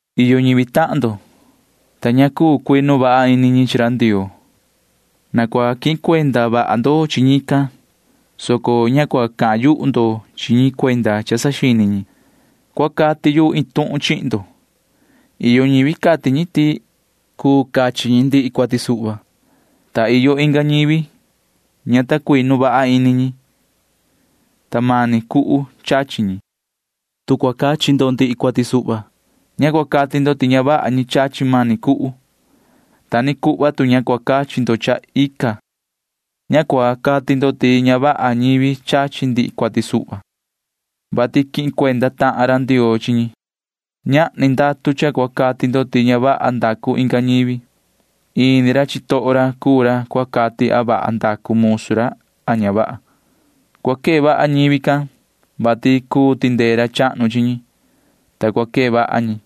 Iyo ñivi tahan ndo, ta ña ta cuu vaha cuinu ini ñi chi ra Ndioo. Na cua quihin cuenda vaha ndo chi ñican, soco ña cua cahan yuhu ndo chi ñi cuenda cha saxini ñi. [Cua cati yu iin tuhun chihin ndo.] Iyo ñivi cati ñi ti cuu cachi ñi ndihi cuati suhva, ta iyo inga ñivi ña ta cuinu vaha ini ñi, ta mani cuhu chachi ñi. Tu cua cachi ndo ndihi cuati suhva, ña cua cati ndo ti ña vaha ñi chachi mani cuhu. Ta ni cuhva tu ña cua cachi ndo cha ica, ña cua cati ndo ti ña vaha ñivi chachi ndihi cuati suhva, vati quihin cuenda tahan ra Ndioo chi ñi. Ñahni ndatu cha cua cati ndo ti ña vaha ndacu inga ñivi. Ini ra chitoho ra cuu ra cua cati a vaha ndacu musu ra a ña vaha. Cua quee vaha ñivi can, vati cuu tindee ra chahnu chi ñi, ta cua quee vaha ñi.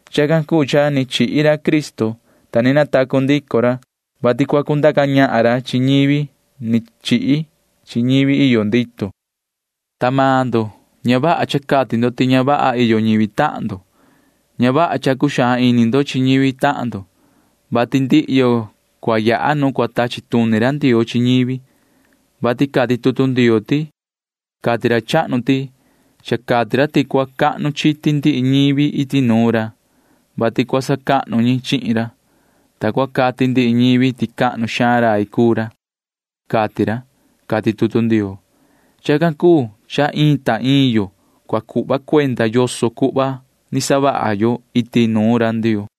Chacan cuu cha ni chihi ra Cristo, ta ni natacu ndico ra, vati cua cundaca ñahan ra chi ñivi ni chihi chi ñivi iyo ndito. Ta maan ndo ña vaha cha cati ndo ti ña vaha iyo ñivi tahan ndo. Ña vaha cha cuxaan ini ndo chi ñivi tahan ndo, vati cua yaha ndihi yo nu cua tachi tuni ra Ndioo chi ñivi, vati cati tutu Ndioo ti: Cati ra chahnu ti cha cati ra ti cua cahnu chiti ndihi ñivi iti nuun ra, [vati cua sacahnu ñi chihin ra,] ta cua cati ndihi ñivi ti cahnu xaan rai cuu ra, cati ra, cati tutu Ndioo. Chacan cuu cha ta iin ta iin yo cua cuhva yo cuenda yoso cuhva ni savaha yo iti nuun ra Ndioo.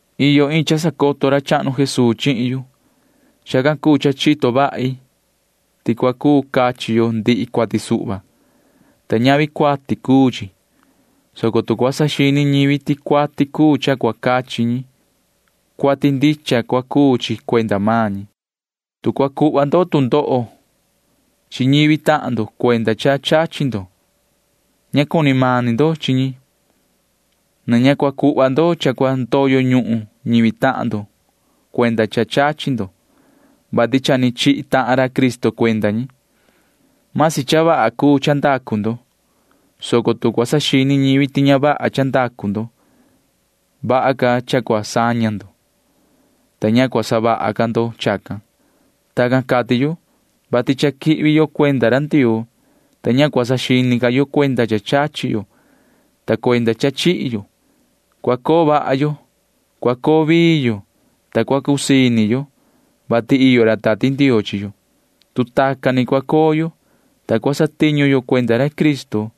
Iyo iin cha sacoto ra chahnu Jesuu chihin yu. Chacan cuu cha chito vahi ti cua cuu cachi yo ndihi cuati suhva, ta ñavi cuati cuu chi, soco tu cua saxini ñivi ti cuati cuu cha cua cachi ñi, cuati ndicha cua cuu chi cuenda maan ñi. Tu cua cuhva ndo tu ndoho chi ñivi tahan ndo cuenda cha chachi ndo, ña cuni mani ndo chi ñi. Na ña cua cuhva ndo cha cua ndoyo ñuhun ñivi tahan ndo cuenda cha chachi ndo, vati cha ni chihi tahan ra Cristo cuenda ñi. Vasi cha vaha cuu cha ndacu ndo, soco tu cua saxini ñivi ti ña vaha cha ndacu ndo, vaha ca cha cua saña ndo, ta ña cua savaha ca ndo chacan. Tacan cati yu, vati cha quihvi yo cuenda ra Ndioo, ta ña cua saxini ca yo cuenda cha chachi yo ta cuenda cha chihi yo. Cua coo vaha yo, cua coo vii yo, ta cua cusii ini yo, vati iyo ra Tati Ndioo chi yo. Tu tacan ni cua coo yo, ta cua satiñu yo cuenda ra Cristo,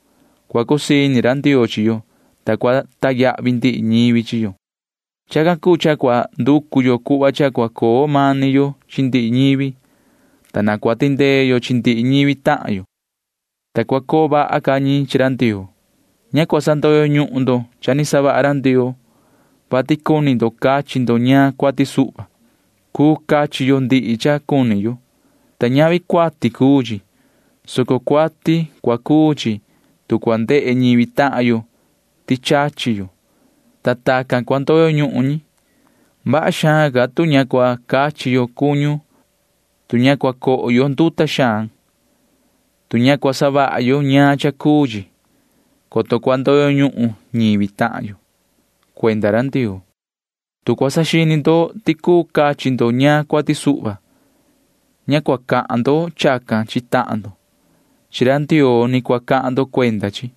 cua cusii ini ra Ndioo chi yo, ta cua sacahnu ndihi ñivi chi yo. Chacan cuu cha na cua nducu yo cuhva cha cua coo mani yo chi ndihi ñivi, ta na cua tindee yo chi ndihi ñivi tahan yo, ta cua coo vaha ca ñi chi ra Ndioo. Ña cua sandoyo ñuhun ndo cha ni savaha ra Ndioo, vati cuni ndo cachi ndo ñaan cuati suhva. Cuu cachi yo ndihi cha cuni yo, ta ñavi cuati cuu chi, soco cuati cua cuu chi, tu cua ndehe ñivi tahan yo ti chachi yo, ta tacan cua ndoyo ñuhun ñi. Vaha xaan cua savaha yo, tu ña cua cachi yo cuñu, tu ña cua coho yo nduta xaan, tu ña cua savaha yo ñaan cha cuu chi, coto cua ndoyo ñuhun ñivi tahan yo cuenda ra Ndioo. Tu cua saxini ndo ti cuu cachi ndo ñaan cuati suhva, ña cua cahan ndo chacan chi tahan ndo. Chi ra Ndioo ni cua cahan ndo chacan.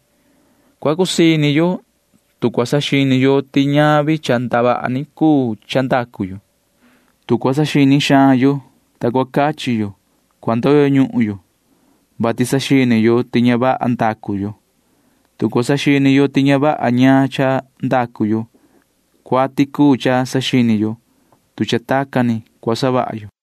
Cua cusii ini yo, tu cua saxini yo ti ñavi cha ndavaha ni cuu cha ndacu yo. Tu cua saxini xaan yo, ta cua cachi yo, cua ndoyo ñuhun yo, vati saxini yo ti ña vaha ndacu yo. Tu cua saxini yo ti ña vaha ñaan cha ndacu yo, cua savaha ndicha yo cuati, tu cha tacan ni cua savaha yo.